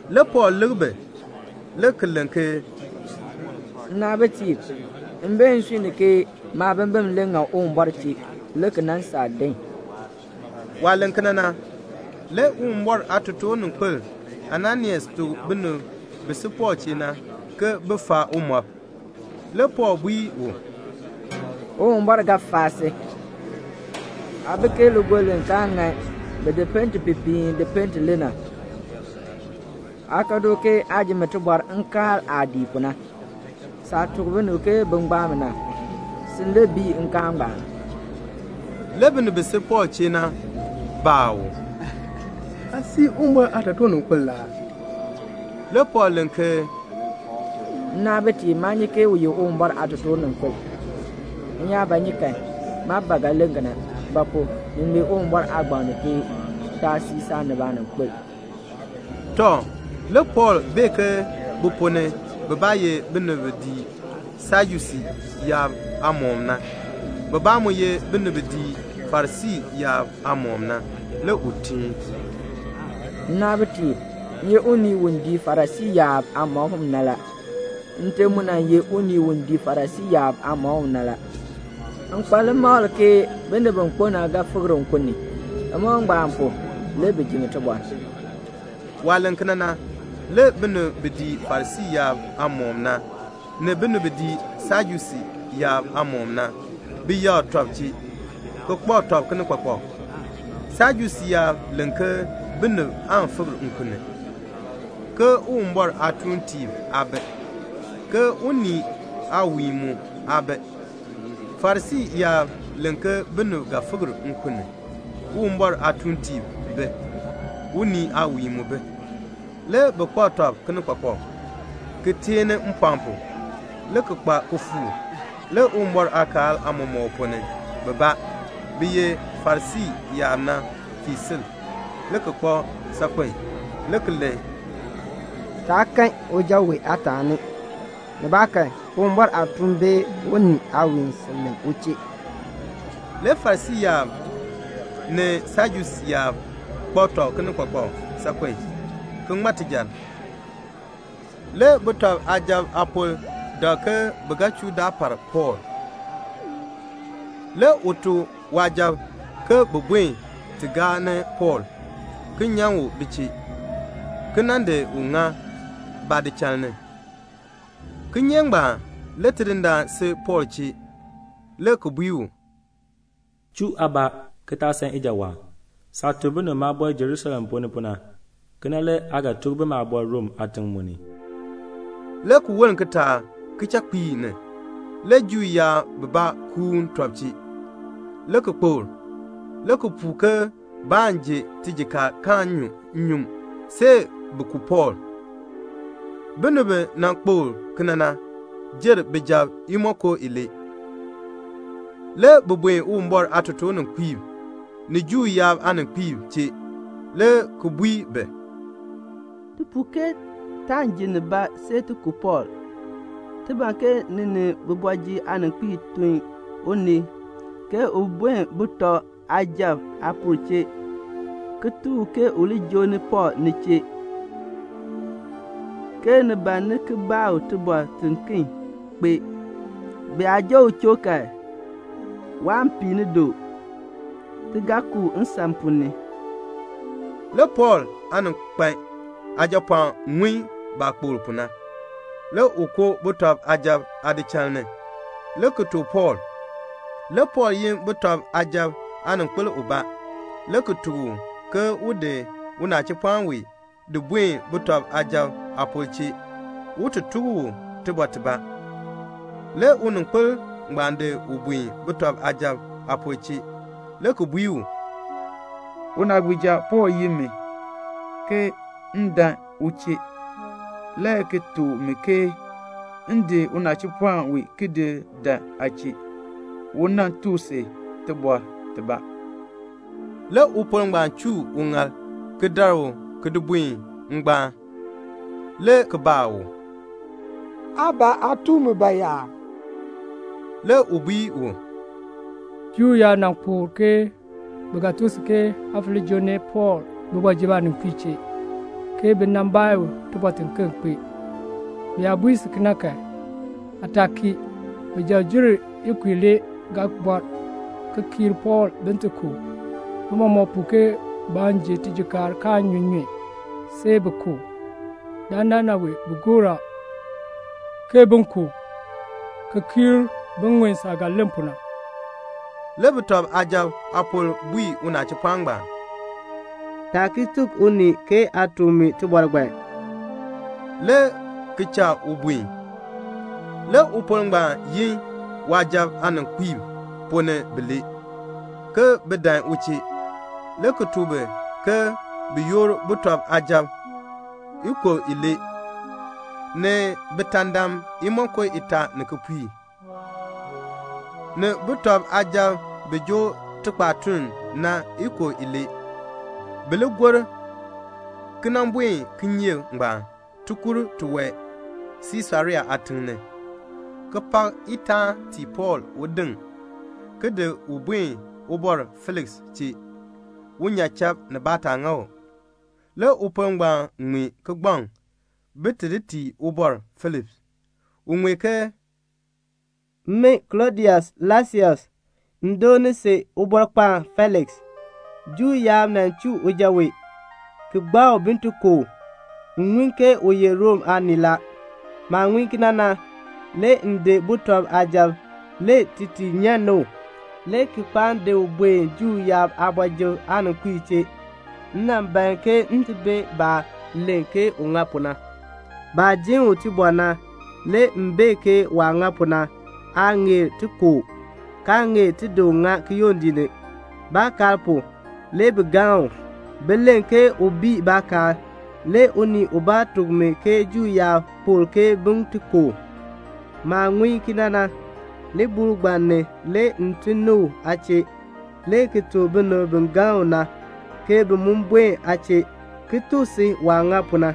Le Pɔɔl lik bi le ki len ke, "Nnaabitiib, m bee nsui ni ke maabimbin le ŋan Uwumbɔr chee, le ki di nan saa din." Waah len kena na, le Uwumbɔr aatotoorninkpil Ananias tuk binib bi si Pɔɔl chee na ke bin faa umɔb. Le Pɔɔl bui u, "Uwumbɔr ga faa si. Aa bi ke ligoln li kaa ŋan, bi di pente pipiin di pente le na. Aa ka du, ke aa ji mi tibɔr nkaal aah dii pu na. Saah tuk binib ke bin gbaa mi na, sin le bii nkaal." Le binib bi si Pɔɔl chee na baa u, "Aa sii Uwumbɔr aatotoorninkpil la aa?" Le Pɔɔl len ke, "Nnaabitiib, maa nyi ke u ye Uwumbɔr aatotoorninkpil. M yaa ba nyi kan, maa ba ga len kena; ba pu? ni ŋmee Uwumbɔr aagbaŋ ni ke, 'Taa sii saanib aaninkpil."' Tɔ, le Pɔɔl bee ke bi ponn ni bibaa ye binib bi dii Sajusii yaab aamɔkm na, bibaa mu ye binib bi dii Farisii yaab aamɔkm na. Le u teen, "Nnaabitiib, m ye unii u dii Farisii yaab aamɔkm na la. Nte mu nan ye unii u dii Farisii yaab aamɔkm na la. M kpa limakl ke binib bi kpo na ga fikr nkun ni. Limakl ngbaan pu, le bi ji mi tibɔr." Waah len kena na, le binib bi dii Farisii yaab aamɔkm na, ni binib bi dii Sajusii yaab aamɔkm na, bi yakr tɔb chee, ki kpak tɔb kinikpakpak. (Sajusii yaab len ke binib aan fikr nkun ni, ke Uwumbɔr aatuuntiib aa bi, ke unii aawiin mu aa bi. Farisii yaab len ke binib ga fikr nkun ni, Uwumbɔr aatuuntiib bi, unii aawiin mu bi.) Le bi kpak tɔb kinikpakpak, ki teeni mpɔɔn pu, le ki kpa kifuuk. Le Uwumbɔr aakaal aamɔmɔkb ponn ni bibaa, bi ye Farisii yaab na fii sil, le ki kpak saakpen, le ki len, "Taa kan uja wee aataani. Nibaakan Uwumbɔr aatuun bee unii aawiin sil len u chee." Le Farisii yaab ni Sajusii yaab kpak tɔb kinikpakpak saakpen, ki ŋma tijar. Le sujatiib aapor dak ke bi ga chuu daar par Pɔɔl. Le u tuk waasujatiib ke bin buen ti gaa ni Pɔɔl, ki nyan u bi chee, ki nan di ŋa baadichal ni. Kinyeek ngbaan, le Tidindaan si Pɔɔl chee, le ki bui u, "Chuu aabaa, ki taa san ijawaan. Saah tuk binib maabɔr Jerusalem ponn ni pu na, kena le aa ga tuk bi maabɔr Rom aatiŋ mu ni." Le ki woln kitaak kichakpiik ni, le Juu yaab bibaa kuun tɔb chee, le ki kpokl, le ki puu ke baan ji tijikaar kaan nyu nnyun see bi ku Pɔɔl. Binib bi nan kpokl kena na jer bijab imonko ilee. Le bi buen Uwumbɔr aatotoorninkpiib ni Juu yaab aaninkpiib chee, le ki bui bi, "Ti puu ke taan ji nibaa see ti ku Pɔɔl. Ti ban ke ni ni kooti ni aaninkpiib tun unii ke un buen sujatiib aapor chee, ki tuk u ke u li joo ni Pɔɔl ni chee, ke ni ban ni ki baa u tibɔr tiken kpee. Bi yaa joo u choo kan, waan pii ni du. Ti ga ku u nsan ponn ni." Le Pɔɔl aaninkpan aajapɔɔn ŋun baah kpokl pu na. Le u koo sujatiib aadichal ni, le ki tuk Pɔɔl. Le Pɔɔl yin sujatiib aaninkpil ubaa, le ki tuk u ke un di unachipɔɔn wee di buen sujatiib aapor chee, un ti tuk u tibɔr tibaa. Le uninkpil ngbaan di u buen sujatiib aapor chee, le ki bui u, "Unaagbiija Pɔɔl yin mi, ke m dan u chee, le ki tuk mi ke m di unachipɔɔn wee di dan aa chee, u nan tuk si tibɔr tibaa." Le upor ngbaan chuu uŋaal ki dar u ki di buen ngbaan, le ki baa u, "Aa ban aa tuk mi bayaa?" Le u bui u, "Juu yaab nan kpokl, ke bi ga tuk si ke aa fo li joo ni Pɔɔl kooti ni aaninkpiib chee, ke bi nan baa u tibɔr tiken kpee. Bi yaa bui si kena kan, aa taa kii. Bijab jer imonko ilee ga bɔr ki kiir Pɔɔl bin ti ku u. Bi mɔmɔk puu ke baan ji tijikaar kaan nyu nnyun, see bi ku u. Dandana wee bi gor a, ke bin ku u, ki kiir bin ŋun saah ga len pu na." Le sujatiib aapor bui unachipɔɔn ngbaan, "Taa ki tuk unii ke aa tuk mi tibɔr ngbaan," le ki cha u buen. Le upor ngbaan yin waasujatiib aaninkpiib ponn ni bilee, ke bin dan u chee, le ki tuk bi ke bin yoor sujatiib ikub ilee, ni bitaandam imonko itaa ni kipiik, ni sujatiib bi joo tikpaatuln na ikub ilee, bi li gor ki nan buen kinyeek ngbaan tikur tiwae Siisarea aatiŋ ni, ki pak itaan tii Pɔɔl un diŋ, ki di u buen Ubɔr Feliks chee, un nyan chakb, nibaa taa ŋa u. Le upor ngbaan ŋmee kigbaŋ bin ti tii Ubɔr Feliks. U ŋmee ke: "Min Klɔdius Laisias, m doon si Ubɔrkpaan Feliks. Juu yaab nan chuu uja wee, ki gbaa u bin ti ku u. M ŋun ke u ye Rom aanii la. Maah ŋun kena na, le m di sujatiib le ti ti nyan ni u, le ki kpaan di u buen Juu yaab aakooti ni aaninkpiib chee. M nan ban ke m ti bee baah len ke u ŋa pu na. Baah jin u tibɔr na, le m bee ke waah ŋa pu na, naa ŋeer ti ku u, kaa ŋeer ti di u ŋa kiyondiik ni. Baakaal pu, le bi galn u. Bi len ke u bii baakaal. Le unii ubaa tuk mi ke Juu yaab kpokl ke bin ti ku u. Maah ŋun kena na, libuul ngbaan ni le m tun ni u aa chee, le ki tuk binib bi galn u na, ke bin mu buen aa chee, ki tuk si waah ŋa pu na."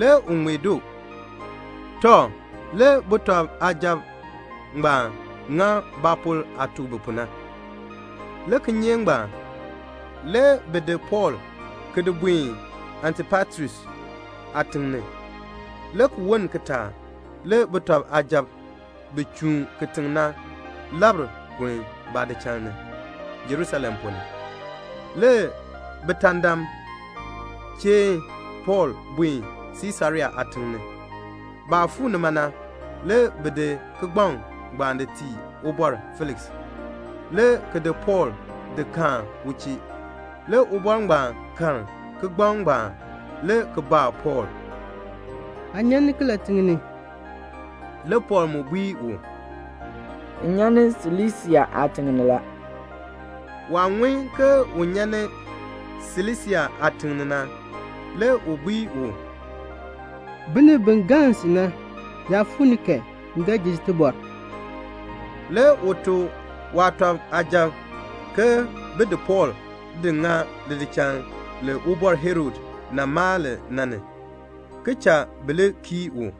Le u ŋmee doo. Tɔ, le sujatiib ngbaan ŋa baapor aah tuk bi pu na. Le kinyeek ngbaan, le bi di Pɔɔl ki di buen Antipatris aatiŋ ni. Le ki woln kitaak le sujatiib bi chuun kitiŋ na labr kun baadichal ni Jerusalem ponn ni. Le bitaandam cheen Pɔɔl buen Siisarea aatiŋ ni. Baah fuu nima na, le bi di kigbaŋ ngbaan di tii Ubɔr Feliks, le ki di Pɔɔl di kaan u chee. Le ubɔr ngbaan karn kigbaŋ ngbaan, le ki baa Pɔɔl, "Aa nyan ni kilatiŋ ni?" Le Pɔɔl mu bui u, "M nyan ni Silisia aatiŋ ni la." Waah ŋun ke u nyan ni Silisia aatiŋ ni na, le u bui u, "Binib bi galn si na yaa fuu ni kan, m ga ji si tibɔr." Le u tuk waasujatiib ke bin di Pɔɔl di ŋa lidichal li Ubɔr Herod nan maa li na ni, ki cha bi li kii u.